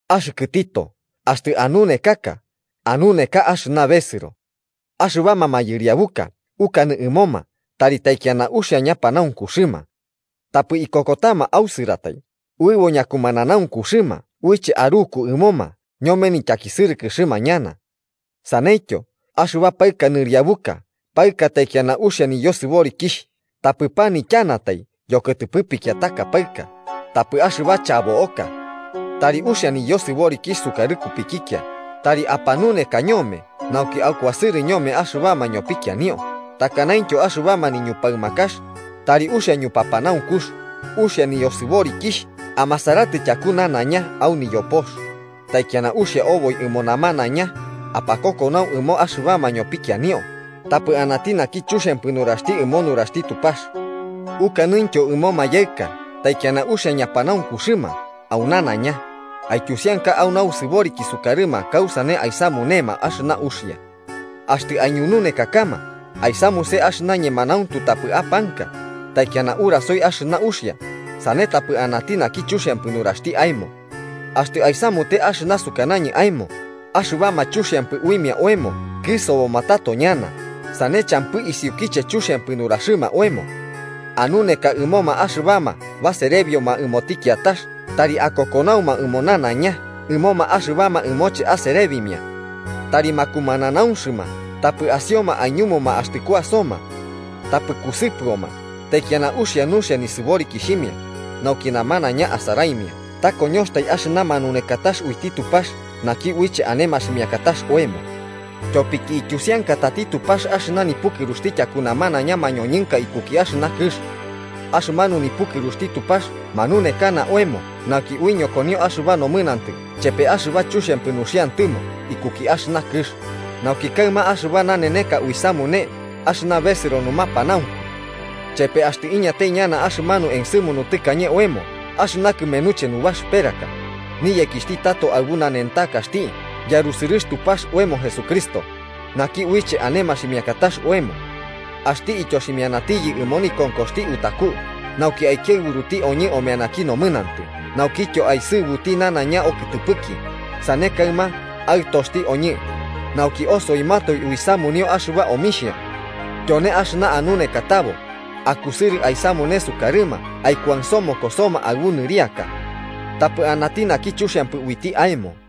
Axɨkɨ Tito, axtɨ anunekaka, anuneka axɨna besɨro. Axɨbama mayɨriabuka, ukanɨ ɨmoma tari taikiana uxia ñapanaunkuxɨma. Tapɨ ikokotama ausɨratai, uɨbo ñakumananaunkuxɨma uiche aruku ɨmoma ñome ñityakisɨrɨkɨxɨma ñana. Saneityo, axɨba paɨka nɨriabuka paɨka taikiana uxia niyosɨborikixh, tapɨ panityanatai yokɨtɨpɨ pikiataka paɨka, tapɨ axɨba chabo'oka. Tari uxia niyosɨborikixh sukarɨ kupikikia tari apanuneka ñome nauki akuasɨrɨma ñome axɨbama ñopikianio takanaintyo axɨbama niñupaɨmakax, tari uxia ñupapanaunkux, uxia niyosɨborikixh, amasaratɨ tyaku nanaiña au niyopox, taikiana uxia oboi ɨmo namanaiña apakokonau ɨmo axɨbama ñopikianio, tapɨ anati naki chuxiampɨ nuraxti ɨmo nuraxti Tupax. Ukanɨntyo ɨmo mayaɨka taikiana uxia ñapanaunkuxɨma au nanaiña, aityusianka ui nasɨboriki sukarɨma kausane aisamunema axɨna uxia. Axtɨ aiñununekakama, aisamuse axɨna ñemanauntu tapɨ apanka, taikiana urasoi axɨna uxia, sane tapɨ anati naki chuxiampɨ nuraxti aemo. Axtɨ aisamute axɨna sukanañɨ aemo, axɨbama chuxiampɨ uimia oemo kɨsoboma tato ñana, sane champɨ isiukiche chuxiampɨ nuraxɨma oemo. Anuneka ɨmoma axɨbama baserebioma ɨmoti kiatax tari akokonauma au nanaiña ɨmoma axɨbama ɨmoche aserebimia. Tari makumananaunxɨma tapɨ asioma aiñumuma axtɨ kuasoma. Tapɨ kusɨpɨoma, taikiana uxia nuxia nisɨborikixhimia, nauki namanaiña asaraimia ta koñoxtai axɨna manunekatax uiti Tupax naki uiche ane maximiakatax oemo. Tyopiki ityusiankatati Tupax axɨna nipɨkɨruxti tyaku namanaiña mañoñɨnka ikuki axɨna kɨx. Axɨmanu nipukɨruxti Tupax manunekana oemo nauki uiñokonio axɨba nomɨnantɨ chepe axɨba chuxiampɨ nuxiantɨmo ikuki axɨna kɨx, nauki kaɨma axɨba naneneka uisamune axɨna besɨro numapanaunku. Chepe axtɨ iñatai ñana axɨmanu ensɨmunu tɨkañe oemo axɨna kɨmenuche nubaxɨperaka: niyekixhti tato aɨbu nanentakaxti yarusɨrɨx Tupax oemo Jesucristo, naki uiche ane maximiakatax oemo. Axti ityoximianatiyɨ ɨmo nikonkoxti utaku, nauki aikiaɨburuti oñɨ omeanaki nomɨnantɨ naukityo aisɨbuti nanaiña okɨtɨpɨki, sane kaɨma aɨtoxti oñɨ, nauki osoimatoe uisamunio axɨba omixhia. Tyone axɨna anunekatabo, akusɨrɨ aisamune sukarɨma aikuansomokosoma aɨbu nɨriaka. Tapɨ anati naki chuxiampɨ uiti aemo.